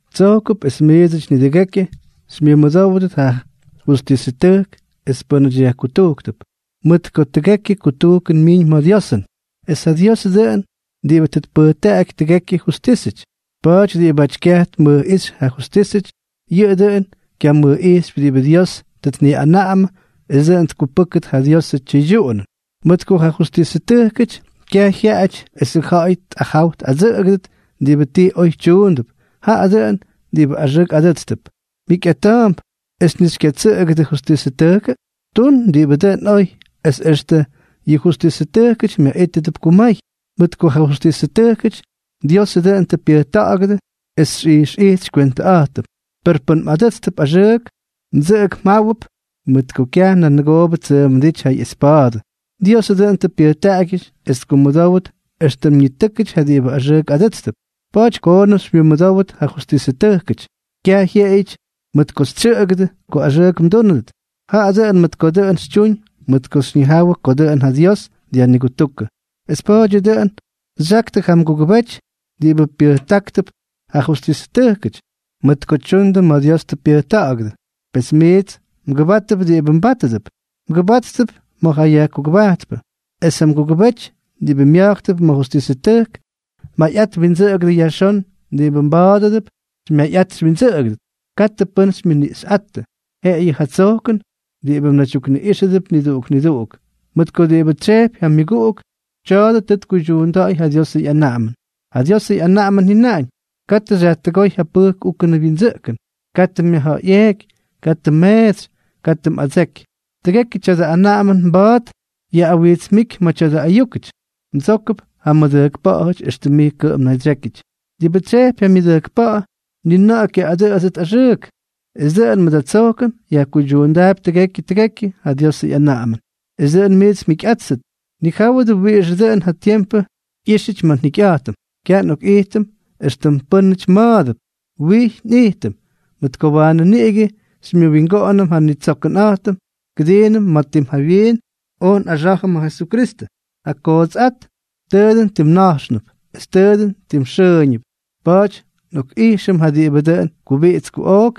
Tsojkʉp es miidsʉty nidʉgekyʉ xymyʉmʉdówdʉt ja justisʉtʉjkʉty es pʉ́nʉty yajkutujktʉp, mʉt ko tʉgekyʉ kutujkʉn myiñ ma̱ Diosʉn, es ja Diosʉ dʉꞌʉn diꞌibʉ tʉ tpʉjtaꞌaky nidʉgekyʉ justísʉty. Pa̱a̱ty diꞌibáty kyamʉjꞌijxypy ja justísʉty, yʉꞌʉ dʉꞌʉn kyamʉjꞌijxypy diꞌibʉ Dios tʉ tniꞌanaꞌamʉ es dʉꞌʉn tkupʉ́kʉt ja Diosʉ tyʉydyuꞌunʉn. Mʉt ko ja justisʉtʉjkʉty kyaj jyaaꞌáty esʉ ja̱ꞌa̱y tꞌajaw tꞌadsʉꞌʉgʉdʉt diꞌibʉ ti oy tyuundʉp, jaꞌa dʉꞌʉn diꞌibʉ axʉʉk adʉ́tstʉp. ¿Mjikyꞌata̱a̱mp es ni xykyatsʉꞌʉgʉdʉ justisʉtʉjkʉ? Tun diꞌibʉ dʉn oy, es extʉ yʉ justisʉtʉjkʉty myaꞌítʉdʉp kumay, mʉt ko ja justisʉtʉjkʉty Diosʉ dʉꞌʉn tʉ pyʉjta̱ꞌa̱gʉdʉ es xyꞌijxꞌijt xykywentʉꞌa̱jtʉm. Per pʉn mꞌadʉtsp axʉʉk, mdsʉꞌʉgʉp mjáwʉp, mʉt ko kyaj nanʉgoobʉ ttsʉʉmʉdíty ja ꞌyespa̱a̱dʉ, Diosʉ dʉꞌʉn tʉ pyʉjtaꞌagyʉty es ttukkumʉdówʉt éxtʉm ñitʉ́kʉty ja diꞌibʉ axʉʉk adʉ́tstʉp. Pa̱a̱ty koonʉm xymyʉmʉdówdʉt ja justisʉtʉjkʉty, kyaj jyeꞌeyʉty mʉt ko xytsyʉꞌʉgʉdʉ ko axʉʉk mdúnʉdʉt, jaꞌa dʉꞌʉn mʉt ko dʉꞌʉn xytyuñ mʉt ko xyñijawʉ ko dʉꞌʉn ja Dios dyajnigutúkʉ. Es pa̱a̱dyʉ dʉꞌʉn xyaktʉ ja mgugʉbety diꞌibʉ pyʉjtáktʉp ja justisʉtʉjkʉty, mʉt ko tyundʉ ma̱ Dios tʉ pyʉjta̱ꞌa̱gʉdʉ. Pes miits mgʉbáttʉp diꞌibʉ mbátʉdʉp. Mgʉbáttʉp ma̱ ja yajkugʉbajtpʉ, es ja mgugʉbety diꞌibʉ mya̱jktʉp ma̱ justísʉty; mayꞌat windsʉꞌʉgʉdʉ yajxón diꞌibʉ mbátʉdʉp xymyayꞌat xywyindsʉꞌʉgʉdʉt. Katʉ pʉ́n xymyʉniꞌxyꞌáttʉ, jeꞌeyʉ ja tsojkʉn diꞌibʉ mnaydyukninuꞌxʉdʉp niduꞌuk niduꞌuk. Mʉt ko diꞌibʉ tsyejpy ja myʉguꞌuk, tya̱a̱dʉ tʉ tkuydyuunda̱ꞌa̱y ja Diosʉ ꞌyanaꞌamʉn. Ja Diosʉ ꞌyanaꞌamʉn jyʉnaꞌañ: “Katʉ xyajtʉgóy ja pʉjk úkʉnʉ wyindsʉꞌkʉn, katʉ myajja̱ꞌa̱yꞌeeky, katʉ mmeetsy, katʉ mꞌadseky.” Tʉgekyʉ tya̱dʉ anaꞌamʉn mba̱a̱t yaꞌꞌawijtsmíky ma̱ tya̱dʉ ayúkʉty: “Mdsókʉp ja mmʉdʉjkpa̱ꞌa̱jʉty éxtʉm mij kʉꞌʉm mnaydsyékyʉty.” Diꞌibʉ tsyejpy ja myʉdʉjkpa̱ꞌa̱, ni na̱ꞌa̱ kyaꞌꞌadʉꞌʉtsʉt axʉʉk. Es dʉꞌʉn mʉt ja tsojkʉn yajkuydyuundaapy tʉgekyʉ tʉgekyʉ ja Diosʉ ꞌyanaꞌamʉn. Es dʉꞌʉn miits mjikyꞌáttʉt, nijáwʉdʉ wiꞌixʉ dʉꞌʉn ja tiempʉ ꞌyíxyʉty ma̱ njikyꞌa̱jtʉm. Kyaj nꞌokꞌijtʉm éxtʉm pʉ́nʉty ma̱a̱dʉp, wijy nꞌijtʉm, mʉt ko waanʉ niꞌigʉ xymyʉwingoꞌonʉm ja nnitsoꞌokꞌa̱jtʉnꞌa̱jtʉm kʉdiinʉm ma̱ tim jawyiin oj nꞌaxá̱jʉm ja Jesukristʉ. Ja kootsꞌát tʉʉ dʉn tim na̱jxnʉp es tʉ dʉn tim xʉʉñʉp, pa̱a̱ty nꞌokꞌʉxtíjʉm ja diꞌibʉ dʉn kubiꞌits kuꞌook,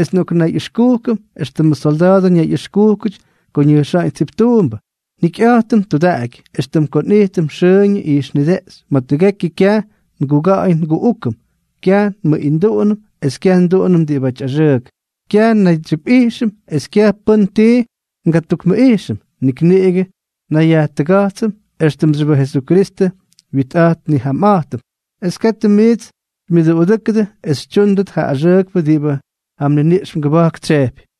es nꞌoknayꞌʉxkujkʉm éxtʉmʉ solda̱a̱dʉ ñayꞌʉxkúkʉty ko ñʉjxa̱ꞌa̱ñ tsiptuumbʉ. Njikyꞌa̱jtʉm tudaꞌaky, éxtʉm ko nꞌijtʉm xʉʉñʉ ijxnideꞌxy ma̱ tʉgekyʉ. Kyaj nguga̱ꞌa̱y nguꞌúkʉm, kyaj nmʉꞌinduꞌunʉm es kyaj nduꞌunʉm diꞌibáty axʉʉk. Kyaj nnaydsyipꞌijxʉm es kyaj pʉ́n ti ngatukmʉꞌijxʉm. Nik niꞌigʉ nnayyajtʉga̱jtsʉm éxtʉmxyʉpʉ Jesukristʉ nwitꞌa̱jt nnijamꞌa̱jtʉm, es katʉ miits xymyʉduꞌudʉ́kʉdʉ es xytyúndʉt ja axʉʉkpʉ diꞌibʉ ja mniniꞌx mgʉba̱jk tsyejpy.